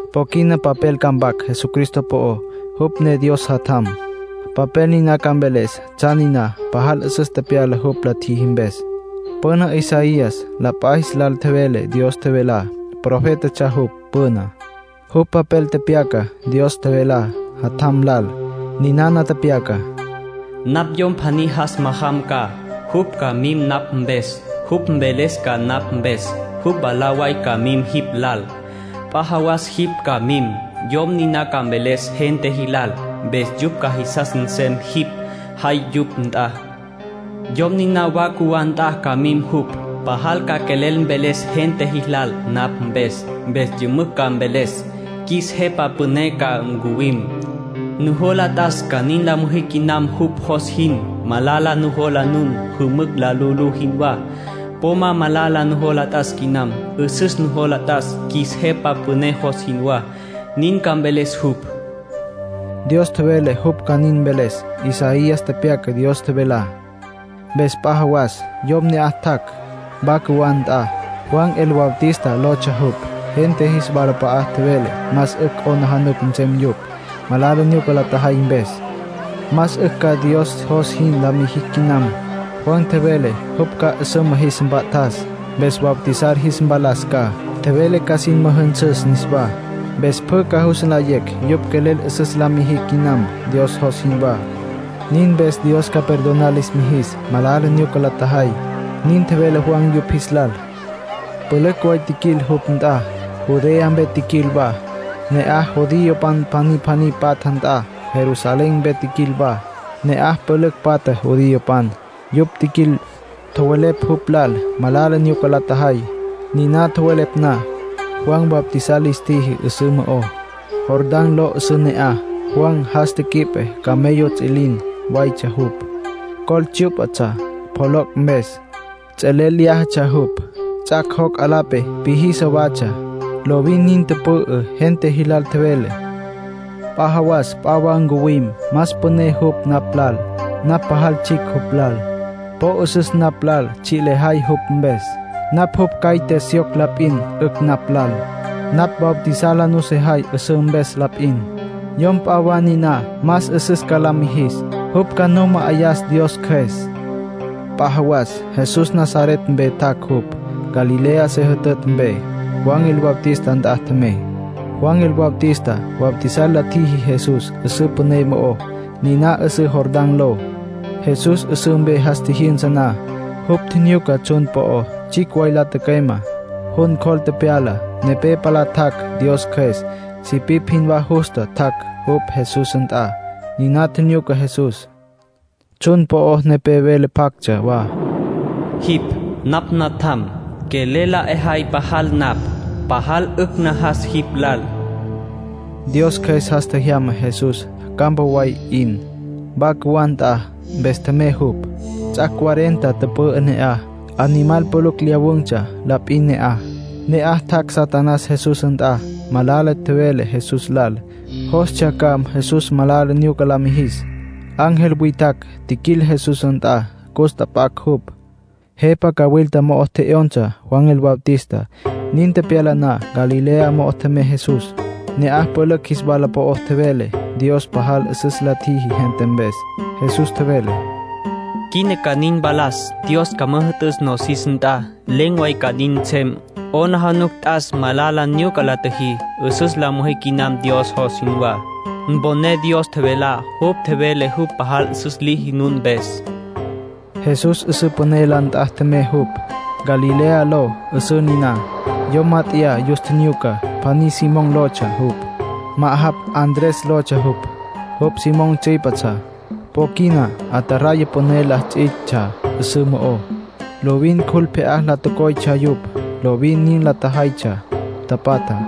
Po quina papel ca mpac Jesucristo po'ó, jupj ne Dios Jatjam. Papel niná ca mveles tsjan niná pajal 'üsüs tepyala jupj la tjiji mpes. Püna Isaías la p'a jis lal tjevele Dios tjevelá. Profétatsja jupj püná. Jupj papel tepyaca Dios tjevelá Jatjam lal. Ninana tepyacá: “Napj yom pjaní jas majam ca. Jupj ca mim napj mpes. Jupj mveles ca napj mpes. Jupj mwalá way ca mim jipj lal. P'a jawas jipj ca mim. Yom niná ca mveles gente jilal. Mpes yupj ca jisas nsem jipj jay yupj nt'a. Yom niná wa cjuwá nt'a ca mim jupj. Pajal ca quelel mveles gente jilal napj mpes. Mpes yümücj ca mveles: ‘Qjuis Jepa Püné ca ncuwim. Nujola t'as ca nin la müjí quinam jupj jos jin. Malala nujola nun jümücj la lu'ulú jinwá. Po ma malala nujola t'as quinam. 'Üsüs nujola t'as, qjuis Jepa Püné jos jinwá’, nin ca mveles jupj.” Dios tjevele jupj ca nin mveles; Isaías tepyaca Dios tjevelá. Mpes p'a jawas yom ne'aj tjac' wa cjuwá nt'a. Juan el Bautista lotsja jupj. Gente jis walap'a'a tjevele más 'ücj 'aplijila nsem yupj, malala nyuca la tjajay mpes. Más 'ücj ca Dios jos jin la mijicj quinam. Juan tjevele jupj ca 'üsüma jis mpa'tas, mpes bautizar jis mpalas ca. Tjevele ca sin müjünsüs niswá. Mpes pjü ca jus nlayecj yupj quelel 'üsüs la mijicj quinam, Dios jos jinwá. Nin mpes Dios ca perdonar lis mijis malala nyuca la tjajay. Nin tjevele Juan yupj jis lal. Pülücj way tjiquil jupj nt'a. Judea mpe tjiquil wa, ne'aj judiopan pjaní pjaní patja nt'a. Jerusalén mpe tjiquil wa, ne'aj pülücj patja judiopan. Yupj tjiquil, tjowelepj jupj lal malala nyuca la tjajay. Niná tjowelepj na, Juan bautizar lis tjiji 'üsǘ mo'ó. Jordán ló 'üsǘ ne'aj. Juan jas quip camello ts'üilin waytsja jupj. Col tsyú'patsja pjoloc' mpes. Ts'elel lyájatsja jupj. Ts'as joc' 'alape píjisa watsja. Lovin nin tüpü'ü. Gente jilal tjevele: “P'a jawas p'a wa ncuwim. Más püné jupj napj lal. Napj pajal tsjicj jupj lal. Po 'üsüs napj lal tsji' lejay jupj mpes. Napj jupj caite syoc la p'in 'ücj napj lal. Napj bautizar la nusejay 'üsǘ mpes la p'in. Yom p'a wa niná más 'üsüs ca la mijis. Jupj ca nu ma'ayas Dios Cjües.” P'a jawas Jesús Nazaret mpe tjac' jupj, Galilea se jütütj mpe. Juan el Bautista nt'a tjemey. Juan el Bautista bautizar la tjiji Jesús 'üsǘ püné mo'ó, niná 'üsǘ Jordán ló. Jesús 'üsǘ mpe jas tjijyünsa na, jupj tjinyuca tsjun po'ó tsjicj way la tücüeme, jun cjol tepyala. Nepé palá tjac' Dios Cjües. Sipipj jinwá justa tjac' jupj Jesús nt'a. Niná tjinyuca Jesús. Tsjun po'o nepé vele pjactsja wa: “Jipj napj Natjam. Quelel la 'ejay pajal napj. Pajal 'ücj najas jipj lal.” Dios Cjües jas tjejyama Jesús campa way 'in, wa cjuwá nt'a. Mpes tjemey jupj. Ts'ac' cuarenta tüpü'ü ne'aj. Animal pülücj lyawun̈tsja la p'in ne'aj. Ne'aj tjac' Satanás Jesús nt'a. Malala tjevele Jesús lal. Jostsja ca Jesús malala nyuca la mijis. Ángel witjacj tjiquil Jesús nt'a, cus tjap'acj jupj. Jepa cawilta mo'o tje'yonsa Juan el Bautista. Nin tepyala na, Galilea mo'o tjemey Jesús. Ne'aj pülücj jis walap'a'a tjevele Dios pajal 'üsüs la tjiji gente mpes. Jesús tjevele: “Quina ca nin mpalas, Dios ca müjü'tüs nosis nt'a. Len̈ way ca nin nsem. 'Aplijila t'as malala nyuca la tjüjí. 'Üsüs la müjí quinam Dios jos jinwá. Mponé Dios tjevelá, jupj tjevele jupj pajal 'üsüs liji nun mpes.” Jesús 'üsǘ püné la nt'a tjemey jupj. Galilea ló 'üsǘ niná. Yom mát'eya yus tjinyuca. Pjaní Simón lotsja jupj. Ma'ajapj Andrés lotsja jupj. Jupj Simón tsüípetsja. Po quina ataraya püné la ts'itsja 'üsǘ mo'ó. Lovin cjul pje'á la coytsja yupj, lovin nin la tjajaytsja, tapatja.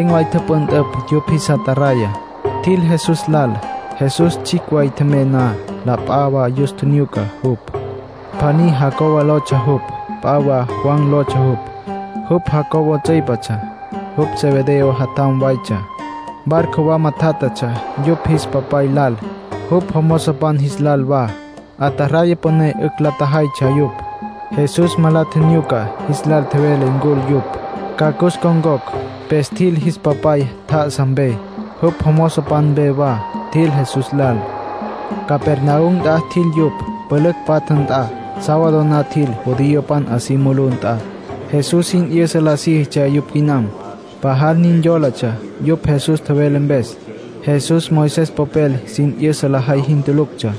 Len̈ way tüpüntüpj yupj jis ataraya, tjil Jesús lal. Jesús tsjicj way tjemey na, la p'a wa yus tjinyuca jupj. Pjaní Jacobo lotsja jupj. P'a wa Juan lotsja jupj. Jupj Jacobo tsüípetsja. Yupj Zebedeo jatjampan waytsja. Barco wama tjátjatsja yupj jis papay lal, jupj jomozopan jis lal wa. Ataraya püné 'ücj la tjajaytsja yupj. Jesús ma la tjinyuca. Jis lal tjevele ncul yupj, ca cus ncon̈cocj. Mpes tjil jis papay tjá'asa mpe, jupj jomozopan mpe wa. Tjil Jesús lal. Capernaum nt'a tjil yupj, pülücj patja nt'a. Sábado na tjil judiopan 'a si mulú nt'a. Jesús sin 'yüsa la síjitsja yupj quinam. Pajal nin yólatsja yupj Jesús tjevele mpes. Jesús Moisés popel sin 'yüsa lajay jin tuluctsja.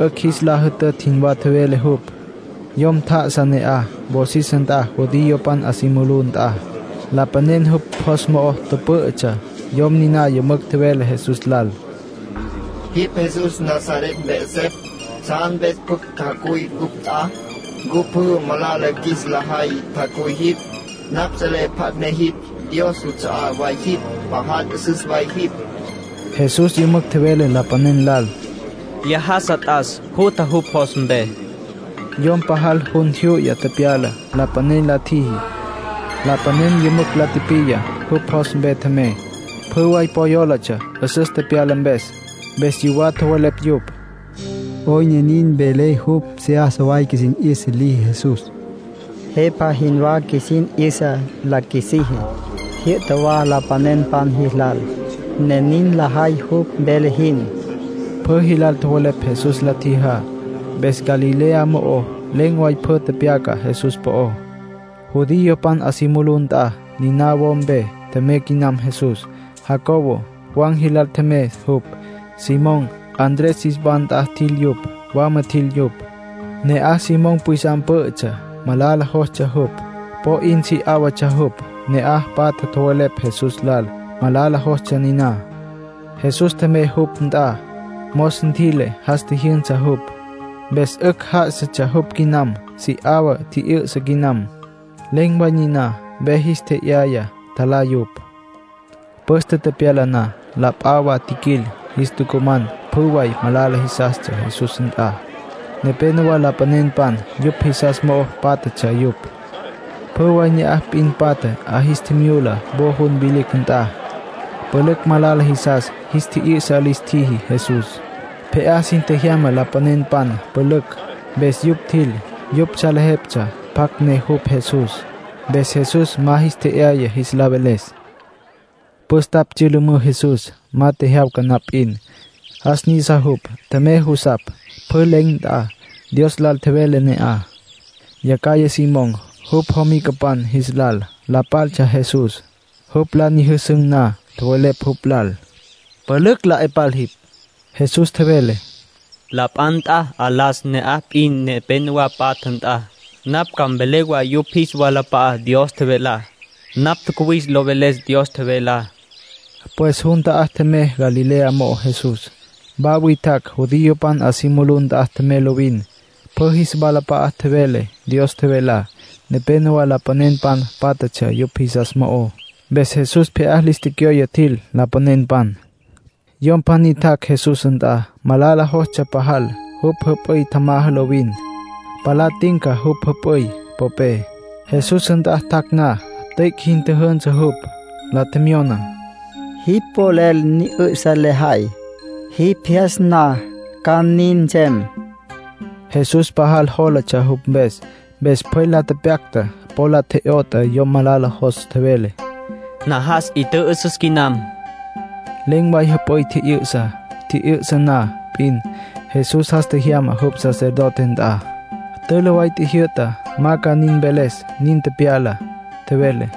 'Ücj jis la jütütj jinwá tjevele jupj. Yom tjá'asa ne'aj, wosis nt'a judiopan 'a si mulú nt'a. Lapanen jupj jos mo'o tüpǘ'ütsja. Yom niná yümücj tjevele Jesús lal: —Jipj Jesús Nazaret mpe 'esepj. ¿Tsjan pjucj tjacuy cupj nt'a? ¿Ncu pjü malala qjuis la jay tjacuy jipj? Napj selé pjacj ne jipj. Dios juts'a'á way jipj. Pajal 'üsüs way jipj. Jesús yümücj tjevele lapanen lal: —¡Lyájasa t'as! ¡Jutja jupj jos mpe! —tjevele. Yom pajal jun jyu'ya tepyala lapanen la tjiji. Lapanen yümücj la tipiya. Jupj jos mpe tjemey. Pjü way po yólatsja 'üsüs tepyala mpes. Mpes yuwá tjowelepj yupj: “¿'Oyn ne nin vele jupj? Seyasa way qjuisin 'yüsa liji Jesús. Jepa jinwá qjuisin 'yüsa la qjuisiji. Jyü'ta wa lapanenpan jilal, ne nin lajay jupj vele jin.” Pjü jilal tjowelepj Jesús la tjijá. Mpes Galilea mo'ó len̈ way pjü tjepjyacan̈ Jesús po'ó. Judiopan 'a si mulú nt'a, niná wo mpe tjemey quinam Jesús. Jacobo, Juan jilal tjemey jupj. Simón, Andrés jis wa nt'a tjil yupj. Wama tjil yupj. Ne'aj Simón pwisam pǘ'ütsja, malala jostsja jupj. Po 'in si 'áwatsja jupj. Ne'aj patja tjowelepj Jesús lal malala jostsja niná. Jesús tjemey jupj nt'a. Mos ntjüi'le, jas tjijyünsa jupj. Mpes 'ücj já'asatsja jupj quinam. Si 'awa tji'yü'sa quinam. Len̈ way niná ve jis tje'yaya, tjalá yupj. Püste tepyala na, la p'a wa tjiquil, jis tucuman pjü way malala jisas Jesús nt'a. Nepénowa lapanenpan yupj jisas mo'o pátjatsja yupj. Pjü way ne'aj p'in patja 'a jis tjimyula wo jun vilicj nt'a. Pülücj malala jisas jis tji'yü'sa lis tjiji Jesús. Pje'á sin tjejyama lapanenpan pülücj. Mpes yupj tjil. Yupj salejeptsja pjacj ne jupj, Jesús. Mpes Jesús ma jis tje'yaya jis la veles. Püstapj tsyülümǘ Jesús, ma tjejyawca na p'in. Jas nisa jupj. Tjemey jusapj, pjü len̈ nt'a. Dios lal tjevele ne'aj. Yacjaya Simón, jupj jomicapan jis lal la tapaltsja Jesús. Jupj la nyüjüsün̈ na, tjowelepj jupj lal: —Pülücj la 'e pal jipj. Jesús tjevele: —La p'a nt'a 'alas, ne'aj p'in nepénowa patja nt'a. Napj ca mvelé wa yupj jis walap'a'á Dios tjevelá. Napj tjacuwis lo veles Dios tjevelá. Pues jun ta'á tjemey Galilea mo'ó, Jesús. Wa witjacj judiopan 'a si mulú nt'a tjemey lovin. Pjü jis walap'a'a tjevele Dios tjevelá. Nepénowa lapanenpan pátjatsja yupj jisas mo'ó. Mpes Jesús pje'á lis tecyoye tjil lapanenpan. Yom pjaní tjac' Jesús nt'a. Malala jostsja pajal. Jupj jüp'üy tjamaja lovin, palá tinca jupj jüp'üy popé. Jesús nt'a tjac' na, tüic' jin tjüjünsü jupj. La tjemyona: —Jipj polel ni 'ü'sa lejay. Jipj jyas na ca nin nsem. Jesús pajal jólatsja jupj mpes. Mpes pjwel la tepyacta, po la tje'yot'a yom malala jos. Tjevele: —Najas. 'I tjü'ü'süs quinam. Len̈ way jüp'üy tji'yü'sa. Tji'yü'sa na p'in, Jesús jas tjejyama jupj sacerdote nt'a. Tülü way tjijyü'ta ma ca nin mveles nin tepyalá. Tjevele: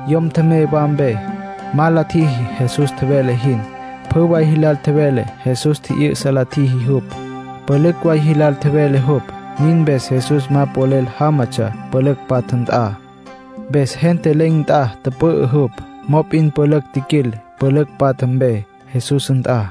Yom tjemey wa mpe. Ma la tjiji Jesús tjevele jin. Pjü way jilal tjevele Jesús tji'yü'sa la tjiji jupj. Pülücj way jilal tjevele jupj. Nin mpes Jesús ma polel jámatsja pülücj patja nt'a. Mpes gente len̈ nt'a tüpü'ü jupj. Mop'in pülücj tjiquil pülücj patja mpe Jesús nt'a.